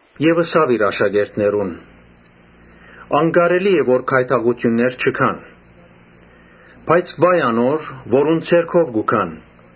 Յիսուս ըսաւ իր աշակերտներուն. «Անկարելի է որ գայթակղութիւններ չի գան. բայց վա՜յ անոր, որուն ձեռքով կու գան։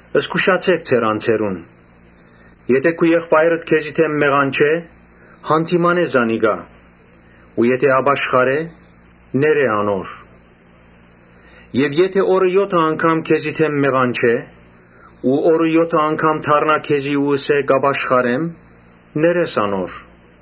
Զգուշութիւն ըրէք ձեր անձերուն։ Եթէ քու եղբայրդ քեզի դէմ մեղանչէ, յանդիմանէ զանիկա։ Եթէ ապաշխարէ, ներէ անոր։ Եթէ օրը եօթը անգամ քեզի դէմ մեղանչէ ու օրը եօթը անգամ դառնայ քեզի ու ըսէ. ‘Կ’ապաշխարեմ’, պէտք է ներես անոր»։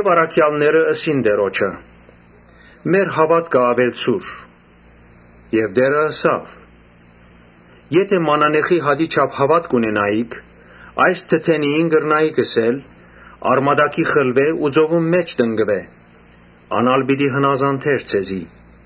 Առաքեալները ըսին Տէրոջը. «Մեր հաւատքը աւելցուր»։ Տէրը ըսաւ. «Եթէ մանանեխի հատի չափ հաւատք ունենայիք, այս թթենիին կրնայիք ըսել. ‘Արմատաքի խլուէ ու ծովուն մէջ տնկուէ’, ան ալ պիտի հնազանդէր ձեզի»։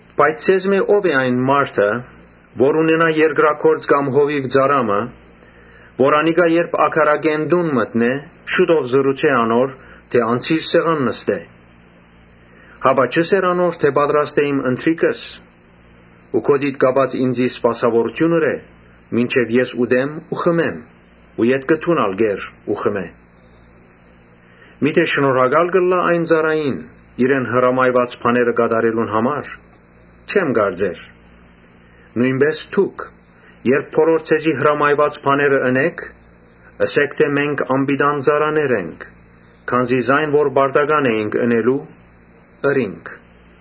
«Բայց ձեզմէ ո՞վ է այն մարդը, որ ունենայ երկրագործ կամ հովիւ ծառայ մը, որ անիկա երբ ագարակէն տուն մտնէ, շուտով ըսէ անոր թէ՝ ‘Անցիր սեղան նստէ’։ Հապա չը՞սեր անոր թէ՝ ‘Պատրաստէ իմ ընթրիքս ու գօտիդ կապած ինծի սպասաւորութիւն ըրէ, մինչեւ ես ուտեմ ու խմեմ ու ետքը դուն ալ կեր ու խմէ’։ Միթէ շնորհակա՞լ կ’ըլլայ այն ծառային, իրեն հրամայուած բաները կատարելուն համար։ Չեմ կարծեր։ Նոյնպէս դուք, երբ բոլոր ձեզի հրամայուած բաները ընէք, ըսէք, թէ՝ ‘Մենք անպիտան ծառաներ ենք, քանզի ինչ որ պարտական էինք ընելու՝ ըրինք’»։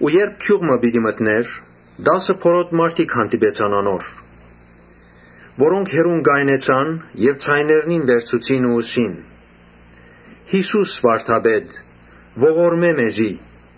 Երբ գիւղ մը պիտի մտնէր, տասը բորոտ մարդիկ հանդիպեցան անոր, որոնք հեռուն կայնեցան, Ձայներնին վերցուցին ու ըսին. «Յիսո՛ւս վարդապետ, ողորմէ մեզի»։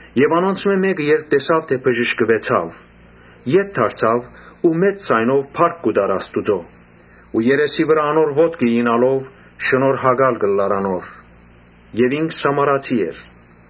Անոնցմէ մէկը, երբ տեսաւ թէ բժշկուեցաւ, ետ դարձաւ ու մեծ ձայնով փառք կու տար Աստուծոյ Ու երեսի վրայ անոր ոտքը իյնալով՝ շնորհակալ կ’ըլլար անոր։ Ինք Սամարացի էր։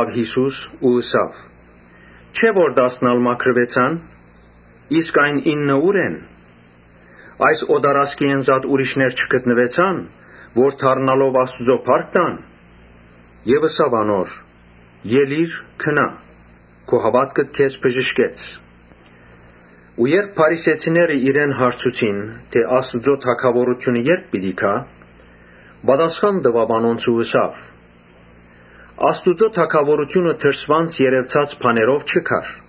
Յիսուս ըսաւ. «Չէ՞ որ տասն ալ մաքրուեցան, իսկ այն ինը ո՞ւր են։ Այս օտարազգիէն զատ ուրիշներ չգտնուեցա՞ն՝ որ դառնալով Աստուծոյ փառք տային»։ Եւ ըսաւ անոր. «Ելի՛ր, գնա՛, քու հաւատքդ քեզ բժշկեց»։ Երբ փարիսեցիները իրեն հարցուցին՝ «Աստուծոյ թագաւորութիւնը ե՞րբ պիտի գայ», պատասխան տուաւ անոնց ու ըսաւ. «Աստուծոյ թագաւորութիւնը դրսէն երեւցած բաներով չի գար։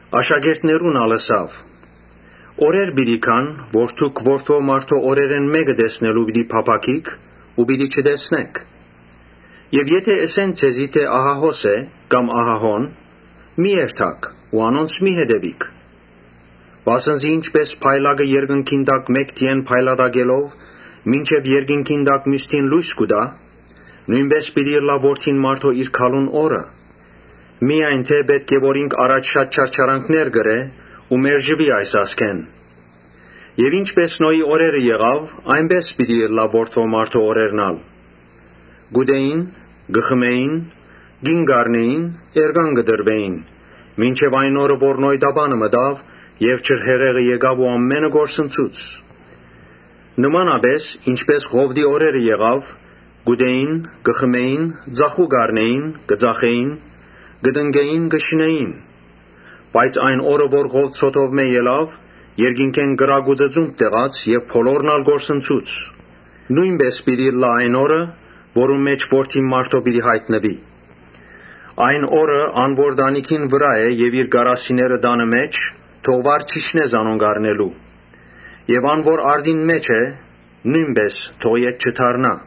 Աշակերտներուն ալ ըսաւ. «Օրեր պիտի գան երբ դուք Որդի մարդոյ օրերէն մէկը տեսնելու պիտի փափաքիք ու պիտի չտեսնէք։ Եւ եթէ ըսեն ձեզի թէ ‘Ահա հոս է’, կամ ‘Ահա՝ հոն’, մի՛ երթաք ու անոնց մի՛ հետեւիք։ Վասն զի ինչպէս փայլակը երկնքին տակ մէկ դիէն փայլատակելով՝ մինչեւ երկնքի տակ միւս դին լոյս կու տայ, նոյնպէս պիտի ըլլայ Որդին մարդոյ իր գալուն օրը։ Միայն թէ պէտք է որ ինք առաջ չարչարանքներ կրէ ու մերժուի այս ազգէն. Ինչպէս Նոյին օրերը եղաւ, այնպէս պիտի ըլլայ Որդի մարդոյ օրերն ալ։ Կ’ուտէին, կը խմէին, կին կ’առնէին, էրկան կը տրուէին, մինչեւ այն օրը՝ որ Նոյ տապանը մտաւ եւ ջրհեղեղը եկաւ ու ամէնքը կորսնցուց։ Նմանապէս՝ ինչպէս Ղովտին օրերը եղաւ։ Կ’ուտէին, կը խմէին, ծախու կ’առնէին, կը ծախէին, կը տնկէին, կը շինէին. Բայց այն օրը երբ Ղովտ Սոդոմէն ելաւ, երկնքէն կրակ ու ծծումբ տեղաց եւ բոլորն ալ կորսնցուց։ Նոյնպէս պիտի ըլլայ այն օրը, երբ Որդին մարդոյ յայտնուի։ Այն օրը ան որ տանիքին վրայ է եւ իր կարասիները տանը մէջ, թող վար չիջնէ զանոնք առնելու եւ ան որ արտին մէջ է, նոյնպէս թող ետ չդառնայ։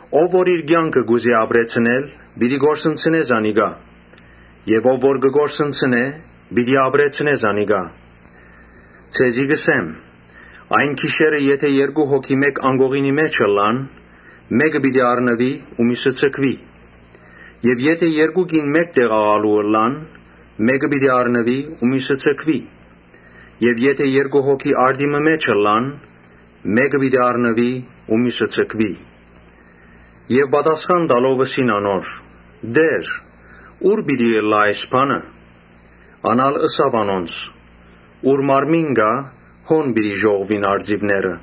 Ով որ իր կեանքը կ’ուզէ ապրեցնել՝ պիտի կորսնցնէ զանիկա եւ ով որ կը կորսնցնէ՝ պիտի ապրեցնէ զանիկա։ Ձեզի կ’ըսեմ. ‘Այն գիշերը եթէ երկու հոգի մէկ անկողնի մէջ ըլլան, մէկը պիտի առնուի ու միւսը ձգուի. Եւ եթէ երկու կին մէկտեղ աղալու ըլլան, մէկը պիտի առնուի ու միւսը ձգուի. եւ եթէ երկու հոգի արտի մը մէջ ըլլան, մէկը պիտի առնուի ու միւսը ձգուի’»։ Պատասխան տալով՝ ըսին անոր. «Տէ՛ր, ո՞ւր պիտի ըլլայ այս բանը»։ Ան ալ ըսաւ անոնց. «Ուր մարմին կայ, հոն պիտի ժողվուին արծիւները»։